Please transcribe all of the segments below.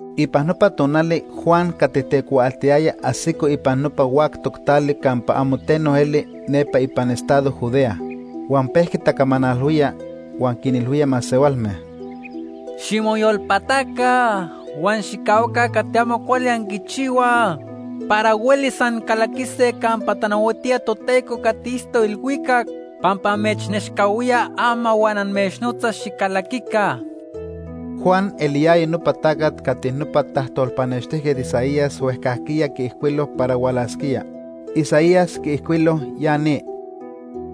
Ipan nopa tonali Juan cati tecuaaltiyaya ajsico ipan nopa huactoc tali campa amo teno eli nepa ipan estado Judea. Huan pejqui tacamanalhuía, huan quinilhuía masehualme: “Ximoyolpataca huan xijcahuaca cati amo cuali anquichihuaj para huelis ancalaquise campa tanahuatía Toteco cati itztoc ilhuicac pampa amechnechcahuía ama huan amechnotza xicalaquica.” Juan eliyaya nopa tacat cati nopa tajtolpanextijquet Isaías huejcajquiya quiijcuilo para hualasquía. Isaías quiijcuilo ya ni: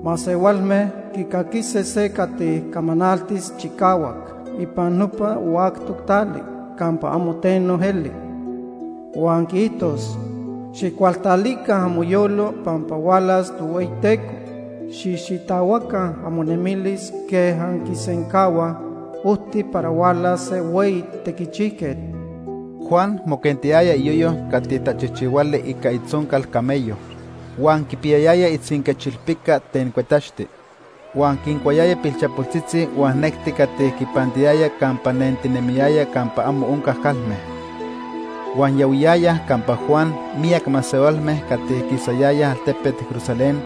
“Masehualme quicaquise se cati camanaltis chicahuac ipan nopa huactoc tali campa amo teno eli. Huan quiijtos: ‘Xijcualtalica amoyolo pampa hualas Tohueyiteco. Xijxitahuaca amonemilis quej anquisencahuaj ojti para hualas se hueyi tequichijquet.’” Juan moquentiyaya iyoyo cati tachijchihuali ica itzoncal camello, huan quipiyayaya itzinquechilpica ten cuetaxti. Huan quincuayaya pilchapoltzitzi huan necti cati quipantiyaya campa nentinemiyaya campa amo onca calme. Huan yahuiyayaj campa Juan miyac masehualme cati quisayayaj altepet Jerusalén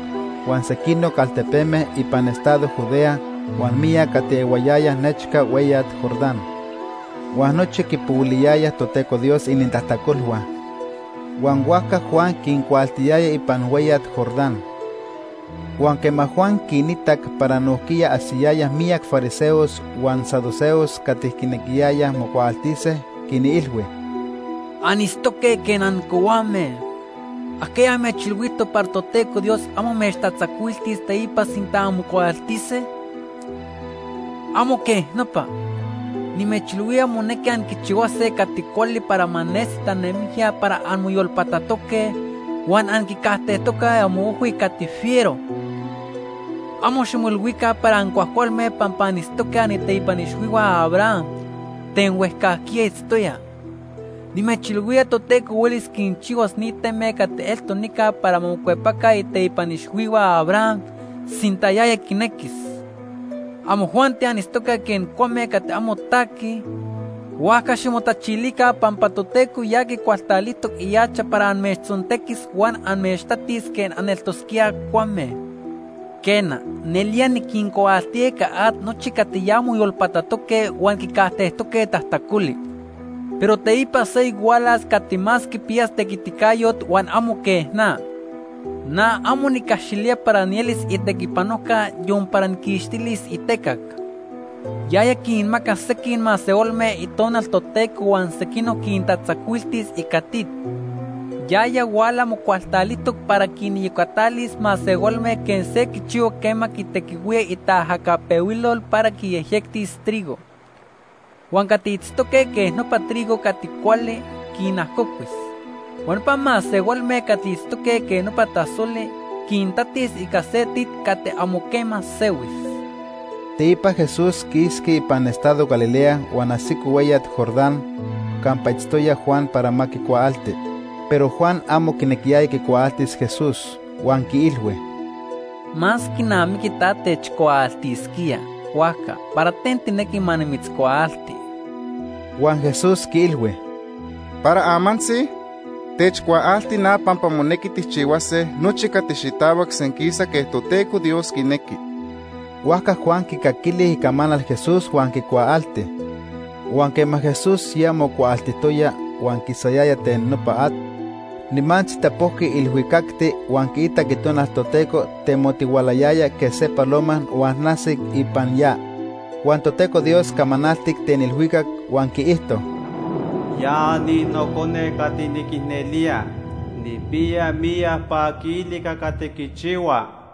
huan sequinoc altepeme ipan estado Judea huan miyac cati ehuayayaj nechca hueyat Jordán. Huan nochi quipohuiliyayaj Toteco Dios inintajtacolhua, huan huajca Juan quincuaaltiyaya ipan hueyat Jordán. Huan quema Juan quinitac para nojquiya ajsiyayaj miyac fariseos huan saduceos cati quinequiyayaj mocuaaltise, quinilhui: “Anitztoque quej ancohuame. ¿Ajquiya amechilhuijtoc para Toteco Dios amo amechtatzacuiltis teipa sinta anmocuaaltise? ¡Amo quej nopa! Nimechilhuía monequi anquichihuase cati cuali para ma nesi tanemijya para anmoyolpatatoque huan anquicajtejtoque amoojhui cati fiero. Amo ximoilhuica para ancuajcualme pampa anitztoque aniteipan ixhuihua Abraham ten huejcajquiya itztoya. Nimechilhuía Toteco huelis quichihuas ni teme cati eltoc nica para ma mocuepaca iteipan ixhuihua Abraham sinta yaya quinequis. Amojuanti anitztoque quej cuame cati amo taquij, huajca ximotachilica pampa Toteco ya quicualtalijtoc ihacha para amechtzontequis huan amechtatis quej aneltosquíaj cuame. “Quena, nelía niquincuaaltía ica at nochi cati ya moyolpatatoque huan quicajtejtoque tajtacoli. Pero teipa seyoc hualas cati más quipiyas tequiticayot huan amo quej na. Na amo nicaxilía para nielis itequipanojca yon para nijquixtilis itecac. Yaya quinmacas sequij masehualme Itonal Toteco huan sequinoc quintatzacuiltis ica tit. Yaya huala mocualtalijtoc para quiniyocatalis masehualme quej se quichihua quema quitequihuía itaajacapehuilol para quiyejyectis trigo. Huan cati itztoque quej nopa trigo cati cuali, quinajocuis. Huan nopa masehualme cati itztoque quej nopa tasoli, quintatis ica se tit cati amo quema sehuis.” Teipa Jesús quisqui ipan estado Galilea huan ajsico hueyat Jordán campa itztoya Juan para ma quicuaalti. Pero Juan amo quinequiyaya quicuaaltis Jesús, huan quiilhui: ―Más quinamiqui ta techcuaaltisquía, huajca ¿para ten tijnequi ma nimitzcuaalti? Huan Jesús quiilhui: ―Para amantzi, techcuaalti na pampa monequi tijchihuase nochi cati xitahuac senquisa quej Toteco Dios quinequi. Huajca Juan quicaquili icamanal Jesús huan quicuaalti. Huan quema Jesús ya mocuaaltijtoya huan quisayaya ten nopa at, nimantzi tapojqui ilhuicacti huan quiitac Itonal Toteco temotihualayaya quej se paloma huan ajsic ipan ya. Huan Toteco Dios camanaltic ten ilhuicac huan quiijto: “Ya ni Nocone cati niquicnelía. Nijpiya miyac paquili ica cati quichihua.”